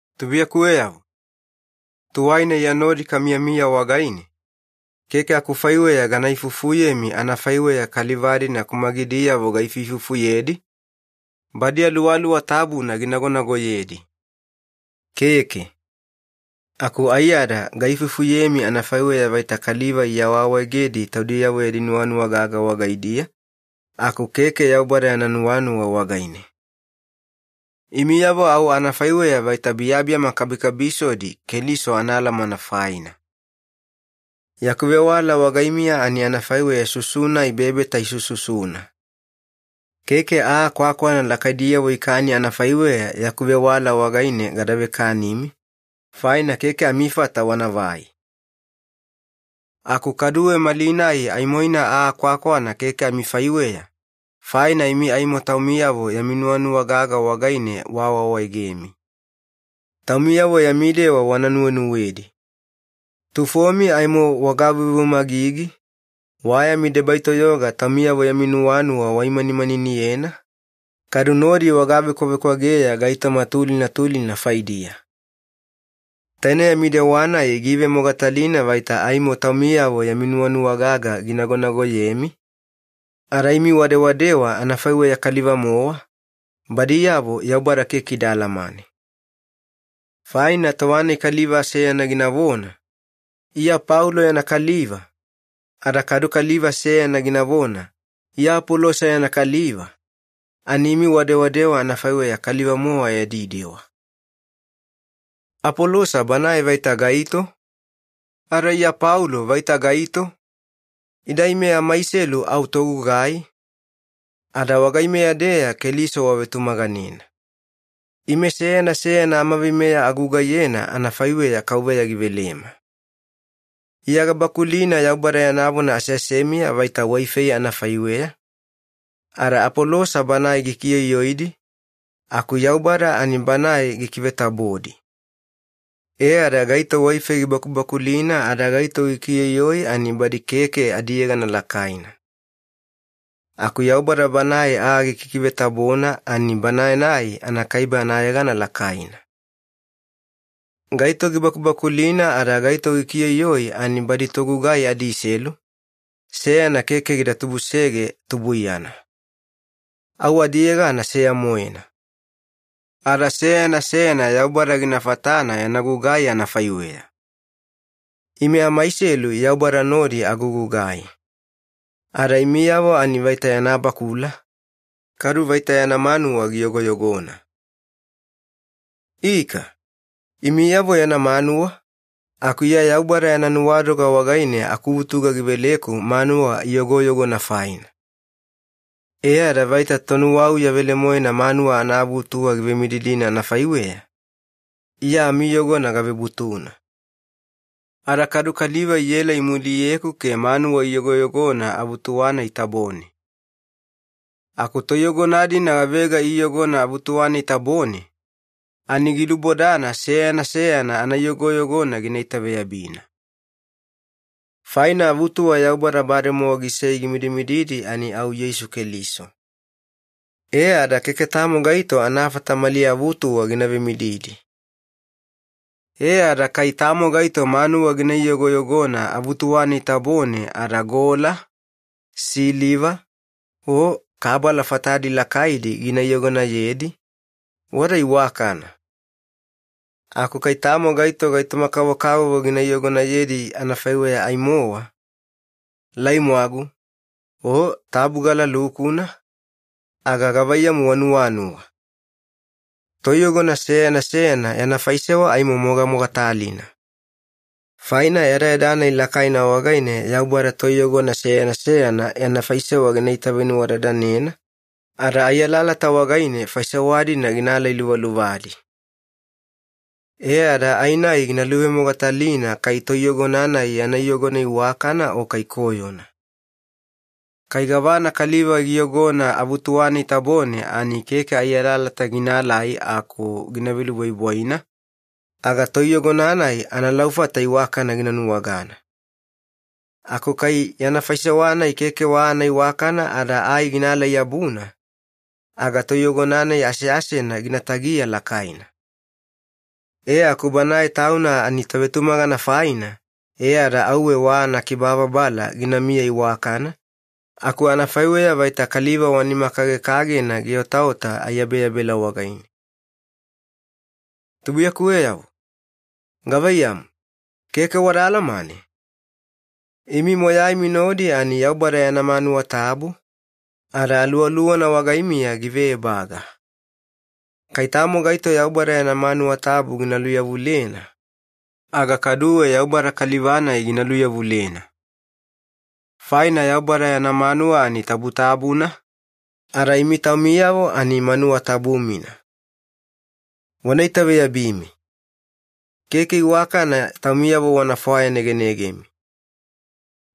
Tubuiyakuweyavo, tuwaina Iya nodi kamiyamiya wagaine, keke akufaiweya gana ifufuyemi anafaiweya kaliva-dina kumagidiyavo gaifuifufuyedi, badi Aluwaluwa Tabuna ginagonagoyedi. Keke. Aku aiyada gaifufuyemi anafaiweya vaita kaliva iawaawaegedi taudiyavo yadi nuwanuwa gaga wagaidiya aku keke Yaubada yana nuwanuwa wagaine. Imiyavo au anafaiweya vaita biyabiyama kabikabisodi Keliso anaalamana faina. Yaku vewala wagaimiya ani anafaiweya susu-nai bebeta isususuna. Keke aa kwakwana lakaidiyavo ikani anafaiweya yaku vewala wagaine gada vekanimi, faina keke amifata wanavai. Aku kaduwe malinai aimoina aa kwakwana keke amifaiweya, faina imi aimo taumiyavo yami nuwanuwa gaga wagaine waawaawaegemi. Taumiyavo yami dewa wana nuwenuwedi. Tufomi aimo wagaveuveumagigi, wa yami debai toyoga taumiyavo yami nuwanuwa waimanimaniniyena, kadu nodi wagavekwavekwageya gaitoma tulina tulina faidiya. Taine yami dewa-nai giivemogatalina vaita aimo taumiyavo yami nuwanuwa gaga ginagonagoyemi, ada imi wadewadewa anafaiweya kaliva-mowa, badiyavo Yaubada keke ida alamane. Faina tova-nai kaliva seyana ginavona, “Iya Paulo yana kaliva,” ada kadu kaliva seyana ginavona, “Iya Apolosa yana kaliva,” ani imi wadewadewa anafaiweya kaliva-mowa yadi dewa. Apolosa banae vaita gaito? Ada Iya Paulo vaita gaito? Ida ime amaiselu au togugai, ada wagaimeya-deya Keliso wavetumaganena. Ime seyana seyana amaveimeya agugaiyena anafaiweya Kauveya givelema. Iya gabakulina Yaubada yana vona aseasemiya vaita waifei anafaiweya, ada Apolosa banae gikioioidi, aku Yaubada ani Banae gikivetabodi. E ada gaito waifei gibakubakulina ada gaito gikioioi, ani badi keke adiyegana lakaina. Aku Yaubada Banae aa gikikivetabona ani Banae-nai anakaibe anayegana lakaina. Gaito gibakubakulina ada gaito gikioioi ani badi togugai adiselu, seyana keke gida tubusege tubuiyana. Au adiyegana seya-moena. Ada seyana seyana Yaubada gina fatana yana gugai anafaiweya. Ime amaiselu Yaubada nodi agugugai. Ada imiyavo ani vaita yana bakula, kadu vaita yana manuwa giyogoyogona. Ika, imiyavo yana manuwa, aku Iya Yaubada yana nuwadoga wagaine akuvutuga giveleku manuwa iyogoyogona faina. E ada vaita tonuwauya velemoena manuwa anaavutuwa givemididina anafaiweya, Iya amiiyogona gavebutuna. Ada kadu kaliva iela imuliyeku ke manuwa iyogoyogona avutuwa-nai tabone. Aku toiyogona-dina gavega iiyogona avutuwa-nai tabone, ani gilubodana seyana seyana anaiyogoyogona gina itaveyabina. Faina avutuwa Yaubada bademowa gisei gimidimididi ani au Yeisu Keliso. E ada keke tamo gaito anafata mali avutuwa gina vemididi. E ada kai tamo gaito manuwa gina iyogoyogona avutuwa-nai tabone ada gola, siliva, o kabala fatadi lakaidi gina iyogonayedi, wada iwakana. Aku kai tamo gaito gaitoma-kavokavovo gina iyogonayedi anafaiweya ai-mowa, laimwagu, o tabugala lukuna, aga gavaiyamu wanuwanuwa? Toiyogona seyana seyana yana faisewa aimo mogamogatalina. Faina yadayada-nai lakaina wagaine Yaubada toiyogona seyana seyana yana faisewa gina itavenuwadadanena, ada ai alalata wagaine faisewa-dina gina alailuvaluvadi. E ada ai-nai gina luvemogatalina kai toiyogona-nai yana iyogona iwakana o kai koyona. Kai gavana kaliva giyogona avutuwa-nai tabone ani keke ai alalata ginaalai aku gina velubwaibwaina, aga toiyogona-nai analaufata iwakana gina nuwagana. Aku kai yana faisewa-nai keke wa anaiwakana ada ai gina ala-yabuna, aga toiyogona-nai aseasena gina tagiya lakaina. E aku banae tauna ani tovetumagana faina e ada auwe wa anakibababala ginamiya iwakana, aku anafaiweya vaita kaliva wa nima kagekagena giotaota aiyabeyabela wagaine. Tubuiyakuweyavo, gavaiyamu, keke wada alamane? Imi moyaimi nodi ani Yaubada yana manuwa tabu, ada Aluwaluwana wagaimiya give ebaga. Kai tamo gaito Yaubada yana manuwa tabu gina luyavulena, aga kaduwe Yaubada kaliva-nai gina luyavulena. Faina Yaubada yana manuwa ani tabutabuna, ada imi taumiyavo ani manuwa tabu-mina. Wana itaveyabimi. Keke iwakana taumiyavo wana fwayanegenegemi.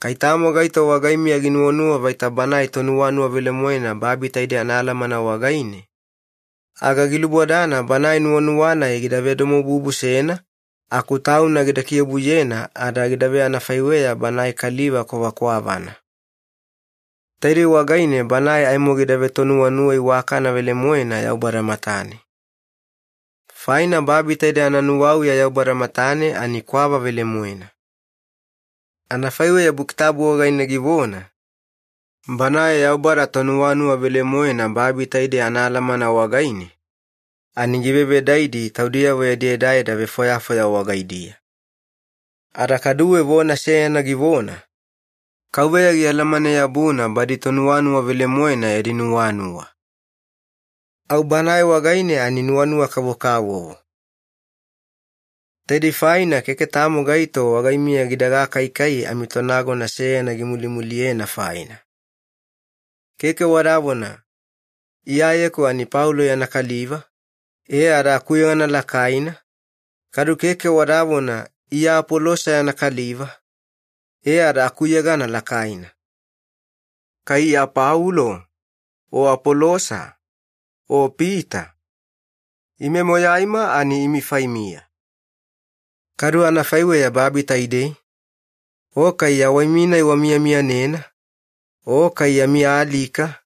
Kai tamo gaito wagaimiya ginuwanuwa vaita banae tonuwanuwa velemoena babi taidei anaalamana wagaine, aga gilubodana banae nuwanuwa-nai gida vedomobubusena aku tauna gida kiobuyena ada gida veanafaiweya banae kaliva kwavakwavana. Taidei wagaine banae aimo gida vetonuwanuwa iwakana velemoena Yaubada matane. Faina babi taidei ananuwauya Yaubada matane ani kwava velemoena. Anafaiweya Buki Tabu wagaine givona, “Banae Yaubada badi tonuwanuwa velemoena babi taidei anaalamana wagaine, ani givevedaidi taudiyavo yadi edaeda vefwayafwaya wagaidiya.” Ada kaduwe vona seyana givona, “KAUVEYA gialamane-yabuna badi tonuwanuwa velemoena yadi nuwanuwa. Au Banae wagaine ani nuwanuwa kavokavovo.” Taidei faina keke tamo gaito wagaimiya gida gakaikai amitonagona seyana gimulimuliyena faina. Keke wadavona, “Iyayeku ani Paulo yana kaliva, e ada akuyegana lakaina,” kadu keke wadavona, “Iya Apolosa yana kaliva, e ada akuyegana lakaina.” Kai Iya Paulo, o Apolosa, o Pita, ime moyaima ani imi faimiya. Kadu anafaiweya babi taidei, o kai yawaimi-nai wamiyamiyanena, o kai yami alika,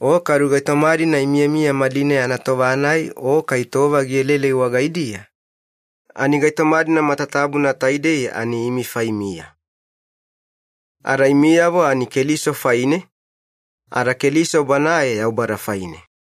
o kadu gaitoma-dina imiyamiya malinai anatova-nai o kai tova gielaelai wagaidiya, ani gaitoma-dina matatabuna taidei ani imi faimiya. Ada imiyavo ani Keliso faine, ada Keliso Banae Yaubada faine.